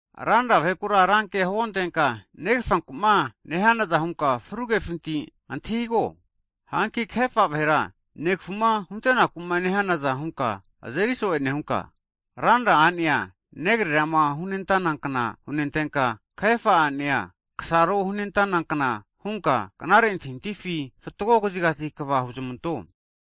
Ranra vahekura rankea huontenka, negafanku'ma nehanaza hunka fru kefinti antahigo, hanki kahefa vahera negfuma huntenaku nehanaza hunka azeri so'e nehunka, ranra a'nea negrerama hunentana kna hunentenka, kahefa a'nea, negasaroma hunentanankna hunka knare antahintahifi fatgo kazigati kva huzmanto.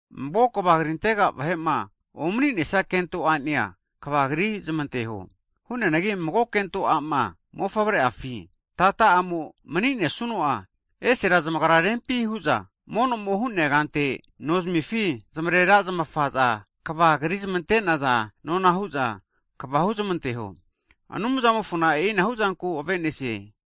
Mago kva krintega vahe'ma omni'nesia kento a'nea, kva krizamanteho. Hu'neanagi mago kento a'ma mofavre'afi, negehoma maninesuno'a esera zamagra rempi hu'za mono'mo hu'nea kante nozamifi zamarera zamafaza kva krizmante'naza nona hu'za kva huzmanteho, Anumzamofona e'inahu zanku ave'nesie.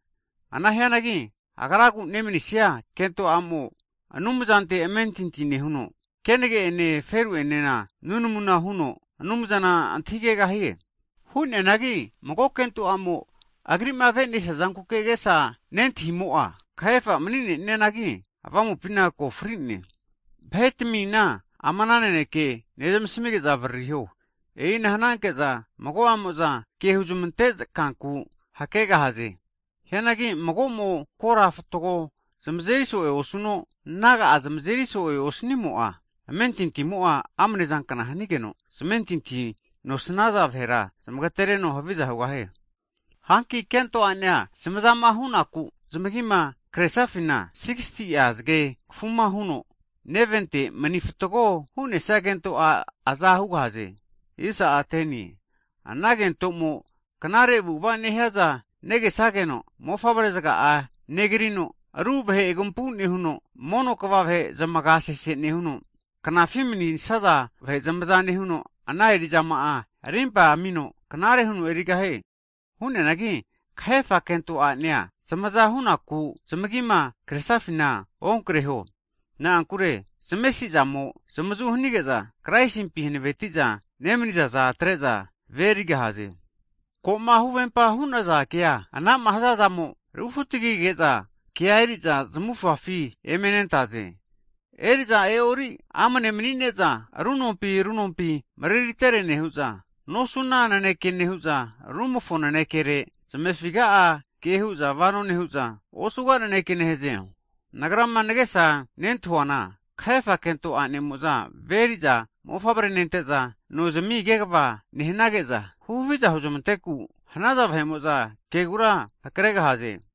Ana hianagi agraku nemnisia kento a'mo, Anumzante amentinti nehuno hanine zgene nunamuna huno Anumzana antahigegahie. Hu'neanagi mago kento a'mo agri'ma avenesia zankuke agesa nentahimo'a, kahefa mani'neanagi avamupina ko fri'ne. Vahe tmina ama naneke zamasmige'za avaririho, e'ina hananke'za mago'amo'za ke huzmante kanku hakegahaze. Hianagi mago'mo kora fatgo'a zamazeri so'e osuno, naga'a zamazeri so'e osnimo'a, amentintimo'a amne zankna hanigeno, zamentinti nosnaza vahera zamagtereno haviza hugahie. Hanki kento a'nea zamazama hunaku zamagima kresafina 60ti'a zge kafuma huno, nevente mani fatgo hu'nesia kento a' aza hugahaze. Ana kentomo knare avu'ava nehiaza negesageno, mofavre zga'a negrino, aru vahe agampu nehuno, mono kva vahe zamaga sese nehuno, knafi mani'nesaza vahe zamaza nehuno, ana eri'zama'a arimpa amino knare huno erigahie. Hu'neanagi kahefa kento a'nea zamaza hunaku zamagima kresafina onkreho, na'ankure zamesi'zamo zamazu hanige'za Kraisimpi hanaveti'za nemniza'za atre'za ve erigahaze. Ko'ma huvempa hu'naza kea anama hazazamo rufu'tagige'za, kea eri'za zamufafi eme nentaze. Eri'za e'ori amne mani'neza, ru nompi ru nompi mreritere nehu'za, nosuna naneke nehu'za, rumofo nanekere zamefiga'a ke hu'za vano nehu'za, osuga naneke nehaze. Nagrama nagesa nentahuana, kahefa kento a'nemo'za ve eri'za mofavre nente'za, no zamia kegva nehnage'za, huhavi'za huzmanteku hanaza vahe'mo'za kegura hakregahaze.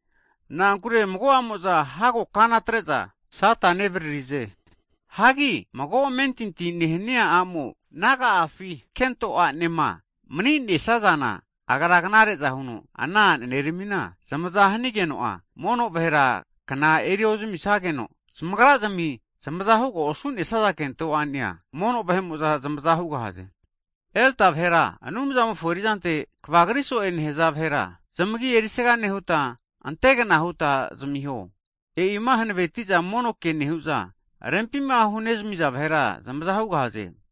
Na'ankure mago'amo'za hago kana atre'za Sata nevririze. Hagi mago amentinti nehnia a'mo naga'afi kento a'nema mani'nesazana, agra knare'za huno ana a'neramina zamaza hanigeno'a, mono vahera kna eri ozamisageno, zamagra'zmi zamaza huga osune'naza kento a'nea, mono vahe'mo'za zamaza hugahaze. Elda vahera, Anumzamofo eri'zante kvagri so'e nehza vahera, zamagi erisaga nehuta antegna huta zamiho (dabol ona), e'ima hanaveti'za mono ke nehu'za, rempima hunezmi'za vahera zamaza hugahaze.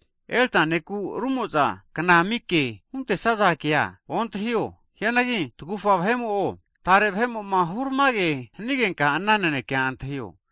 Elda ne'ku rumo'za kna ami ke huntesaza kea ontahio, hianagi tagufa vahe'mo'o, tare vahe'mo'ma huramage hanigenka ana nanekea antahio.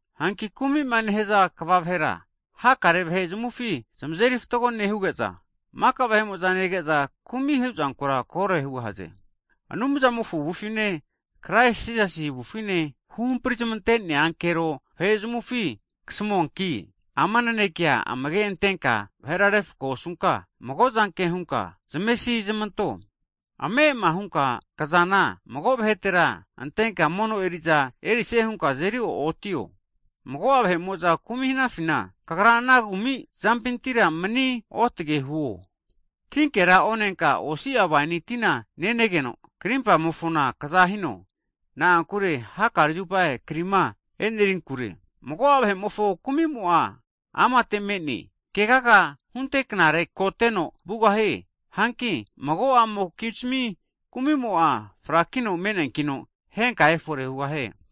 Hanki kumi'ma nehza kva vahera, hakare vahe zamufi zamazeri fatgo nehuge'za, maka vahe'mo'za nege'za, kumi' huzankura kore hugahaze. Anumzamofo avufine, Krais Jisasi avufine, huhampri zamante'nea ankero vahe'zmufi kasamuanki, ama nanekea amage' antenka vahera refko osunka, mago zanke hunka zamesi zamanto. Ame'ama hunka kzana mago vahetera antenka mono eri'za erisie hunka azeri o'otio. Mago'a vahe'mo'za kumi' hanafina kagra ana kumi'zampintira kagra manigru hunka manio. Tinkera onenka, osi'a waini tina nenegeno krimpamofona kza hino, na'ankure hakare zupa krima enerinkure. Mago'a vahe'mofo kumi'mo'a amate me'ne, kegaga hunte knare koteno vugahie. Hanki mago'amokizmi kumi'moa frakino me'neankino henka efore hugahie.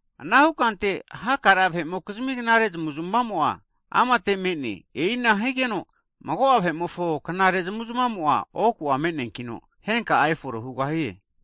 Anahu kante, hakare vahe'mokizmi knare zamu'zmamo'a amate me'ne. E'ina higeno mago'a vahe'mofo knare zamuzmamo'a oku'a me'neankino, henka'a efore hugahie.